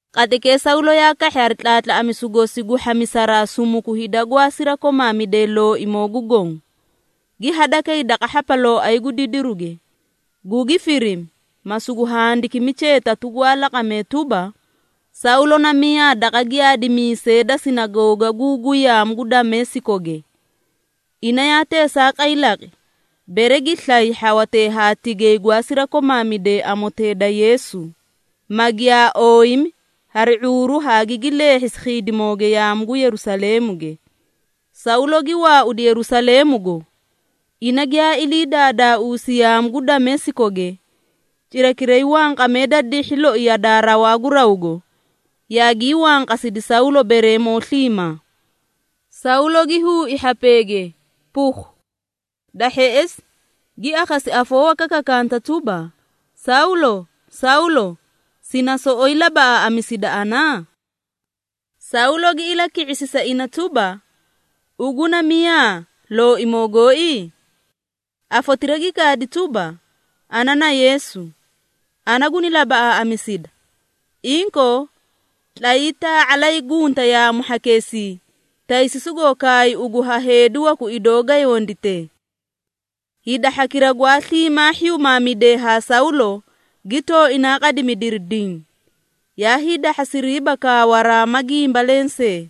Qatlaykee Sawlo yaa kahhi hari tlaatlaꞌamisu gosi gu hhamisaraa sumuku hida gwaa sirakomaamidee Looimoo gu Goõ. Gi hadakay daqa hhapalooay gu didiruge, gugi firimi, ma sugu handikimi cheetatu gwaa laqamee tuba, Sawlo na miyaa daqa giyaadimiisee da sinagoogaguu gu yaamu gu Dameesikoge. Ina yaa teesaaqay laqi, bere gi slay hhawatee haa tigay gwaa sirakomaamidee amotee da Yeesu, ma giyaa ooyimi hari ⁄uuru haa gigi leehhisi khiidimooge yaamu gu Yerusaleemuge. Sawlo gi waaudi Yerusaleemugo. Ina giyaa ilii daadaauusi yaamu gu Dameesikoge, cirakiray wanqamee da dihhi loi yadaa rawaa gu rawgo, yaagii wanqasidi Sawlo bareemoo sliimaa. Sawlo gi huui hhapeege, “Pukhu!” Da hheꞌesi, gi akhasi afoo waka kakanta tuba, “Sawlo, Sawlo, sina soꞌoyi labaꞌaaꞌamisida ana?” Sawlo gi ilaki⁄isi sa ina tuba, “Ugu na miyaa, Looimoo gooi?” Afotira gi kaadi tuba, “Ana na Yeesu. Ana guni labaꞌaaꞌamisida. Inkoo, tlayii taa⁄a lay gunta yaamu hhakeesii, taysi sugoo kaay ugu ha heedi waku idoo ga yondite.” Hida hhakira gwaa sliimaa hhiyumaamidee haa Sawlo gi tooinaa qadimidiri diĩ, yaa hiidahhasiriiba kaawaraa ma gimba lensee.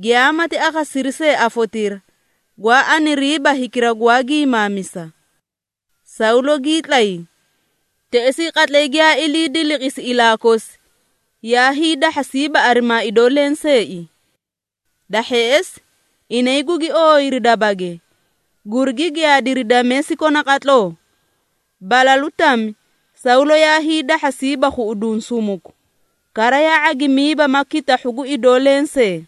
Giyamaati akhasiri see afotira, gwaa aniriiba hikira gwaa gimaamisa. Sawlo gii tlay. Teꞌesii qatlay giyaa ilii diliqisi ilaa kosi, yaa hiidahhasiiba arimaa idoo lenseei. Da hheꞌesi, inay gugi ooyiri dabage, gurigi giyaadiri Dameesiko naqatloo. Balalu tami Sawlo yaa hiidahhasiiba khuꞌuduũ sumuku, kara yaa ⁄agimiiba ma kitahhuu gu idoo lensee.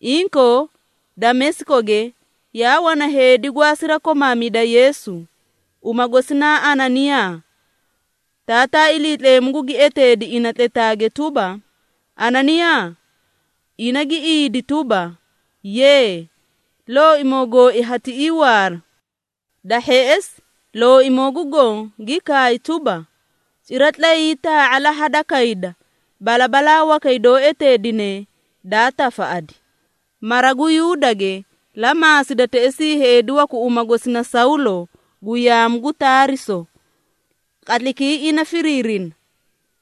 Inkoo, Dameesikoge yaa wana heedi gwaa sirakomaamida Yeesu, uma gosi naa Ananiyaa. Taataa Iliitleemu gugi eteedi ina tletaage tuba, “Ananiyaa!” Ina gi iidi tuba, “Yee! Looimoo gooi ha tiꞌii waara.” Da hheꞌesi, Looimoo gu Goõ gi kaay tuba, “Cira tlayii taa⁄a la hada kayda balabalaa wakay doó eteedine ‘Daa tafaꞌadi,’ mara gu Yuudage la maasida teꞌesii heedi waku uma gosi na Sawlo gu yaamu gu Taariso. Qatlaykii ina firiirina,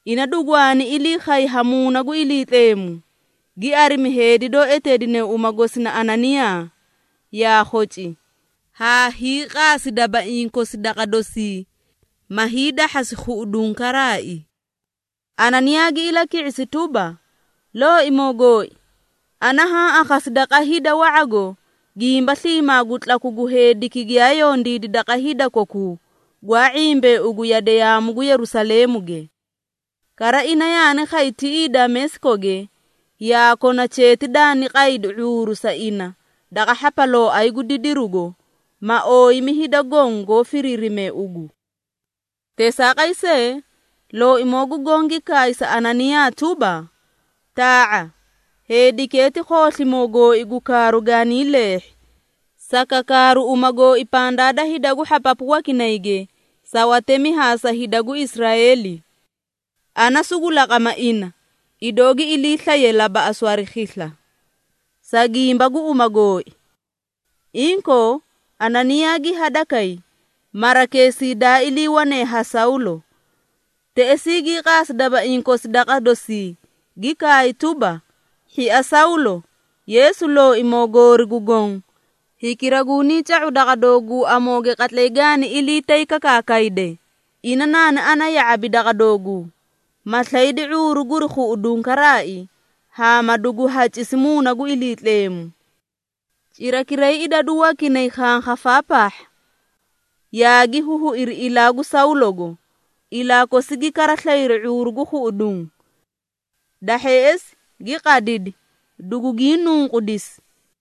ina dugwaani ilii khay ha Muuna gu Iliitleemu, gi arimi heedi doó eteedine uma gosi na Ananiyaa, yaa khoci, haa hiiqaasi dabaiĩ kosi daqa dosii, ma hiidahhasi khuꞌuduũ karaai.” Ananiyaa gi ilaki⁄isi tuba, “Looimoo gooi, ana haã akhasi daqa hida wa⁄ago gimba sliimaa gu tlaku gu heediki giyaa yondiidi daqa hida kokuu gwaa ⁄imbee ugu yade yaamu gu Yerusaleemuge. Kara ina yaani khay tiꞌii Dameesikoge, yaa kona cheeti daani qaydi ⁄uuru sa ina daqa hhapalooay gu didirugo, ma ooyimi hida goõ goó firiirimee ugu.” Teesaaqay see, Looimoo gu Goõ gi kaay sa Ananiyaa tuba, “Taa⁄a! Heedikee ti khooslimoo gooi gu kaaru ganii leehhi, sa kakaaru uma gooi pandaa da hida gu hhapapu wakinayge, sa watemi haa sa hida gu Israeeli. Ana sugu laqama ina, idoo gi iliislaye labaꞌasu hari khisla, sa gimba gu uma gooi.” Inkoo, Ananiyaa gi hadakay, marakeesii daa iliiwane ha Sawlo. Teꞌesii gii qaasi dabaiĩ kosi daqa dosii, gi kaay tuba, “Hhia Sawlo, Yeesu, Looimoo goori gu Goõ, hikira gunii ca⁄u daqa dooguu amooge qatlay gaani ilii tay kakaakayde, ina naani ana ya⁄abi daqa dooguu, ma slaydi ⁄uuru guri khuꞌuduũ karaai haa ma dugu hacisi Muuna gu Iliitleemu.” Cirakiray idadu wakinay khankhafaa pahha, yaagi huhuiri ilaa gu Sawlogo, ilaa kosi gi kara slayri ⁄uuru gu khuꞌuduũ. Da hheꞌesi, gi qadidi, dugugii nunqudisi.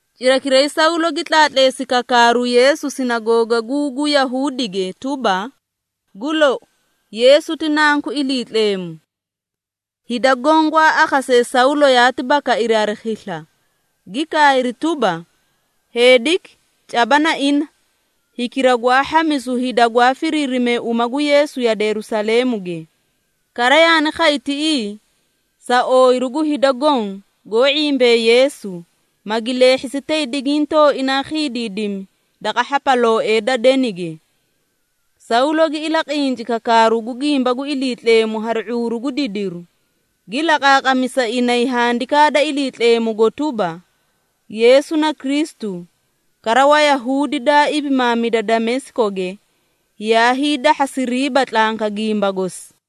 Cirakiray Sawlo gi tlaatleesi kakaaru Yeesu Sinagoogaguu gu Yahuudige tuba, “Gu lou, Yeesu ti Nanku Iliitleemu.” Hida goõ gwaa akhasee Sawlo yaati bakairi hari khisla, gi kaayri tuba, “Heediki, caba na ina, hikira gwaa hhamisu hida gwaa firiirime uma gu Yeesu yade Yerusaleemuge. Kara yaani khay tiꞌii sa ooyiru gu hida goõ goó ⁄imbee Yeesu, magi leehhisi tay digiĩ tooinaa khiidiidimi daqa hhapalooee da denige.” Sawlo gi ilaqinci kakaaru gu gimba gu Iliitleemu hari ⁄uuru gu didiru, gi laqaaqami sa inay Handikaa da Iliitleemugo tuba, “Yeesu na Kristu, kara Wayahuudi daa ibimaamida Dameesikoge, yaa hiidahhasiriiba tlanka gimba gosi.”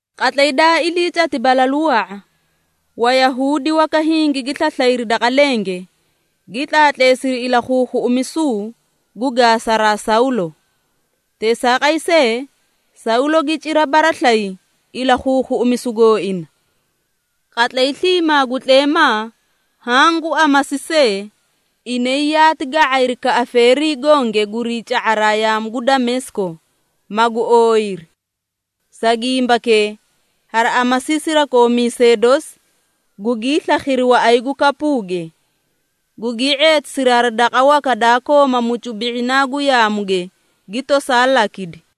Qatlay daa ilii cati balalu wa⁄a, Wayahuudi waka hingigi slaslayri daqa lenge, gi tlaatleesiri ilakhuukhuꞌumisuu gu gaasaraa Sawlo. Teesaaqay see, Sawlo gi cira baraslayi ilakhuukhuꞌumisu gooina. Qatlay sliimaa gu tleemaa haã gu amasii see, inay yaati ga⁄ayri kaꞌafeerii gonge gurii ca⁄araa yaamu gu Dameesiko, magu ooyiri. Sa gimbakee, hari amasi sirakoomiisee dosi, gugii slakhiri waꞌay gu kapuuge, gugii ⁄eetisiri hari daqa waka daa kooma mucu bi⁄inaa gu yaamuge, gi tosaa lakidi.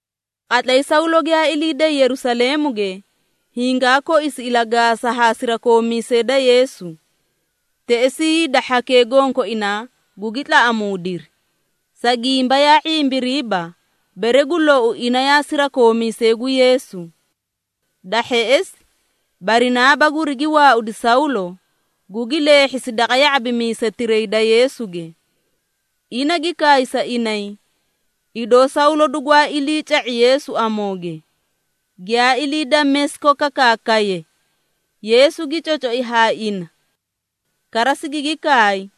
Qatlay Sawlo giyaa ilii day Yerusaleemuge, hingaa koisi ilagaasa haa sirakoomiisee da Yeesu. Teꞌesii hida hhakee gonkoinaa gugi tlaꞌamuudiri, sa gimba yaa ⁄imbiriiba, bere gu lou ina yaa sirakoomiisay gu Yeesu. Da hheꞌesi Barinaaba gurigi waaudi Sawlo, gugi leehhisi daqa ya⁄abimiisetiray da Yeesuge. Ina gi kaay sa inay, idoo Sawlo dugwaa iliica⁄i Yeesu amooge, giyaa ilii Dameesiko kakaakaye, Yeesu gi cocoi haa ina. Kara sigigi kaay,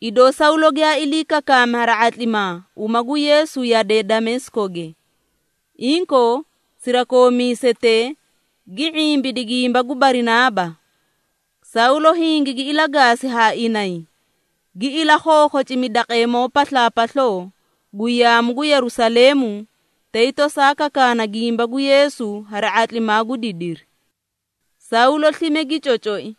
idoo Sawlo giyaa ilii kakaami hari ⁄atlimaa uma gu Yeesu yade Dameesikoge. Inkoo, sirakoomiisetee gi ⁄imbidi gimba gu Barinaaba. Sawlo hingigi ilagaasi haa inay, gi ilakhookhocimi daqeemoo paslaapasloo gu yaamu gu Yerusaleemu tay tosaa kakaana gimba gu Yeesu hari ⁄atlimaa gu didiri. Sawlo slime gi cocoi,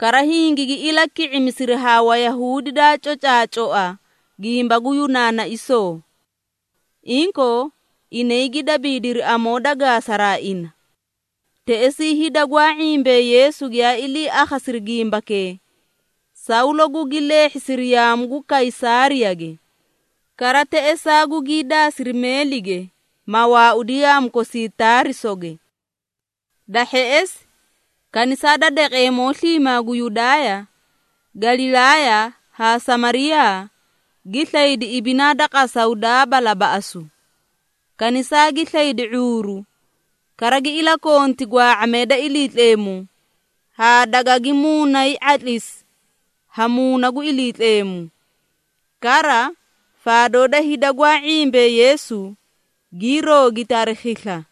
kara hingigi ilaki⁄imisiri haa Wayahuudi daa cocaacoa gimba gu Yunaanaisoo. Inkoo, inay gi dabiidiri amoo da gaasaraa ina. Teꞌesii hida gwaa ⁄imbee Yeesu giyaa ilii akhasiri gimbakee, Sawlo gugi leehhisiri yaamu gu Kaysaariyage. Kara teꞌesaa gugii daasiri meelige, ma waaudi yaamu kosii Taarisoge. Da hheꞌesi kanisaa da daqeemoo sliimaa gu Yudaaya, Galilaaya haa Samariyaa gi slaydi ibinaa da qasaw daaba labaꞌasu. Kanisaa gi slaydi ⁄uuru, kara gi ilakonti gwaa⁄amee da Iliitleemu haa dagagi muunay⁄atlisi ha Muuna gu Iliitleemu. Kara, faadoo da hida gwaa ⁄imbee Yeesu, gii roogiti hari khisla.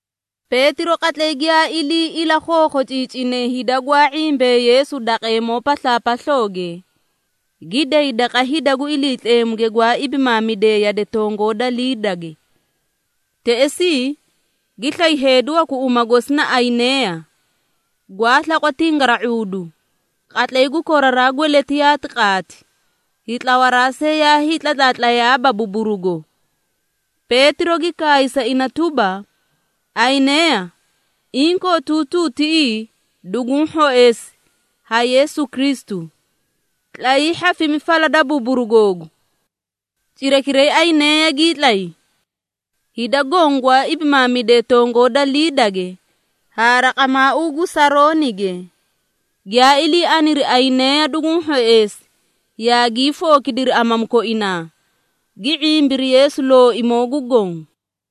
Peetiro qatlay giyaa ilii ilakhookhociicine hida gwaa ⁄imbee Yeesu daqeemoo paslaapaslooge, gi day daqa hida gu Iliitleemuge gwaa ibimaamidee yade tongoo da Liidage. Teꞌesii gi slay heedi waku uma gosi na Ayineeya, gwaa slaqwa tingara⁄uudu, qatlay gu koraraa dagati yaati qaati, hiitlawaraasee yaa hiitlatlaatlayaaba buburuugo. Peetiro gi kaay sa ina tuba, “Ayineeya, inkootuutuu tiꞌii duguũ hhoeesi ha Yeesu Kristu, tlayii hhafimi fala da buburuu googu.” Cirakiray Ayineeya gii tlay. Hida goõ gwaa ibimaamidee tongoo da Liidage haa raqamaauu gu Saroonige, giyaa ilii aniri Ayineeya duguũ hhoeesi, yaagii fookidiri amamu koinaa, gi ⁄imbiri Yeesu Looimoo gu Goõ.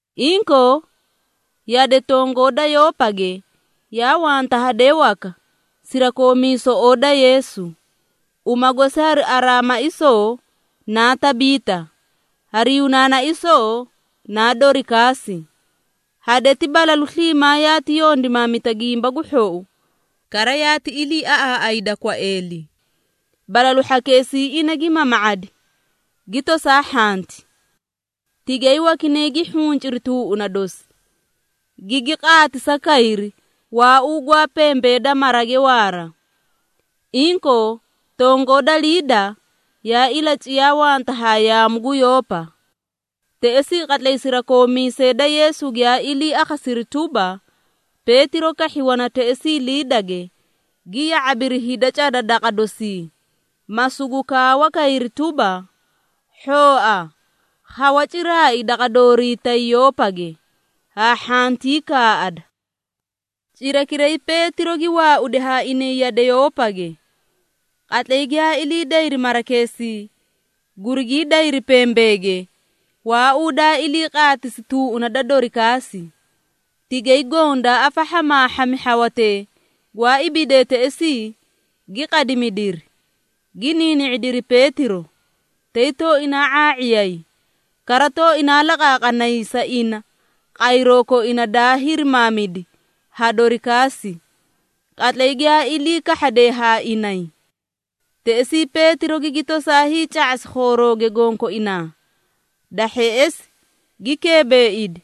Inkoo, yade tongoo da Yoopage yaa wanta hadee waka, sirakomiisoꞌoo da Yeesu, uma gosi hari Araamaisoo naa Tabiita, hari Yunaanaisoo na Dorikaasi. Hadeti balalu sliimaa yaati yondimaamita gimba gu hhou, kara yaati iliiaꞌaaꞌayda kwaeeli. Balalu hhakeesii ina gi mama⁄adi, gi tosaa hhanti. Tigay wakinay gi hhunciri tuuꞌuna dosi, gigi qaatisa kayri waauu gwaa pembee da marage waara. Inkoo, tongoo da Liida yaa ilaciyaa wanta haa yaamu gu Yoopa. Teꞌesii qatlay sirakoomiisee da Yeesu giyaa ilii akhasiri tuba, Peetiro kahhi wana teꞌesii Liidage, gi ya⁄abiri hida cada daqa dosii, ma sugu kaawa kayri tuba, “Hhooa khawa ciraai daqa doori tay Yoopage, haa hhantii kaaꞌada.” Cirakiray Peetiro gi waaudi haa inay yade Yoopage. Qatlay giyaa ilii dayri marakeesii, gurigii dayri pembeege, waauu daa ilii qaatisi tuuꞌuna da Dorikaasi. Tigay goõ daa afahhamaahhami hhawatee gwaa ibiidee teꞌesii, gi qadimidiri, gi niini⁄idiri Peetiro, tay tooinaa ⁄aa⁄iyay, kara tooinaa laqaaqanay sa ina qayroo koina daa hirimaamidi ha Dorikaasi, qatlay giyaa ilii kahhade haa inay. Teꞌesii Peetiro gigi tosaa hiica⁄asi khoorooge gonkoinaa. Da hheꞌesi gi keebeeidi,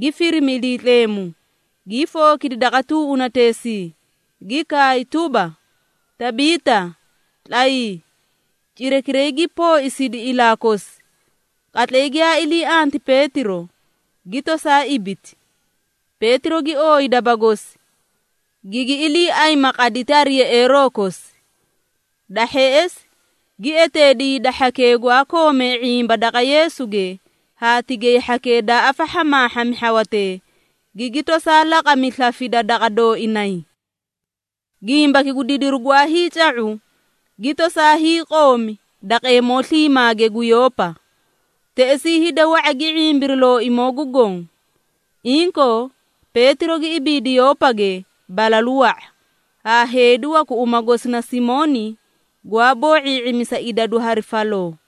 gi firimi Iliitleemu, gii fookidi daqa tuuꞌunateesi, gi kaay tuba, “Tabiita, tlayii!” Cirakiray gi pooisidi ilaa kosi, qatlay giyaa ilii anti Peetiro, gi tosaa ibiti. Peetiro gi ooyi daba gosi, gigi iliiay ma qaditi hari yeꞌeeroo kosi. Da hheꞌesi gi eteedi hida hhakee gwaa koomee ⁄imba daqa Yeesuge haa tigay hhakee daa afahhamaahhami hhawatee, gigi tosaa laqami slafida daqa dooinay. Gimbaki gu didiru gwaa hiica⁄u, gi tosaa hiiqoomi daqeemoo sliimaage gu Yoopa. Teꞌesii hida wa⁄a gi ⁄imbiri Looimoo gu Goõ. Inkoo, Peetiro gi ibiidi Yoopage balalu wa⁄a, haa heedi waku uma gosi na Simooni, gwaa boo⁄ii⁄imisa idadu hari faloo.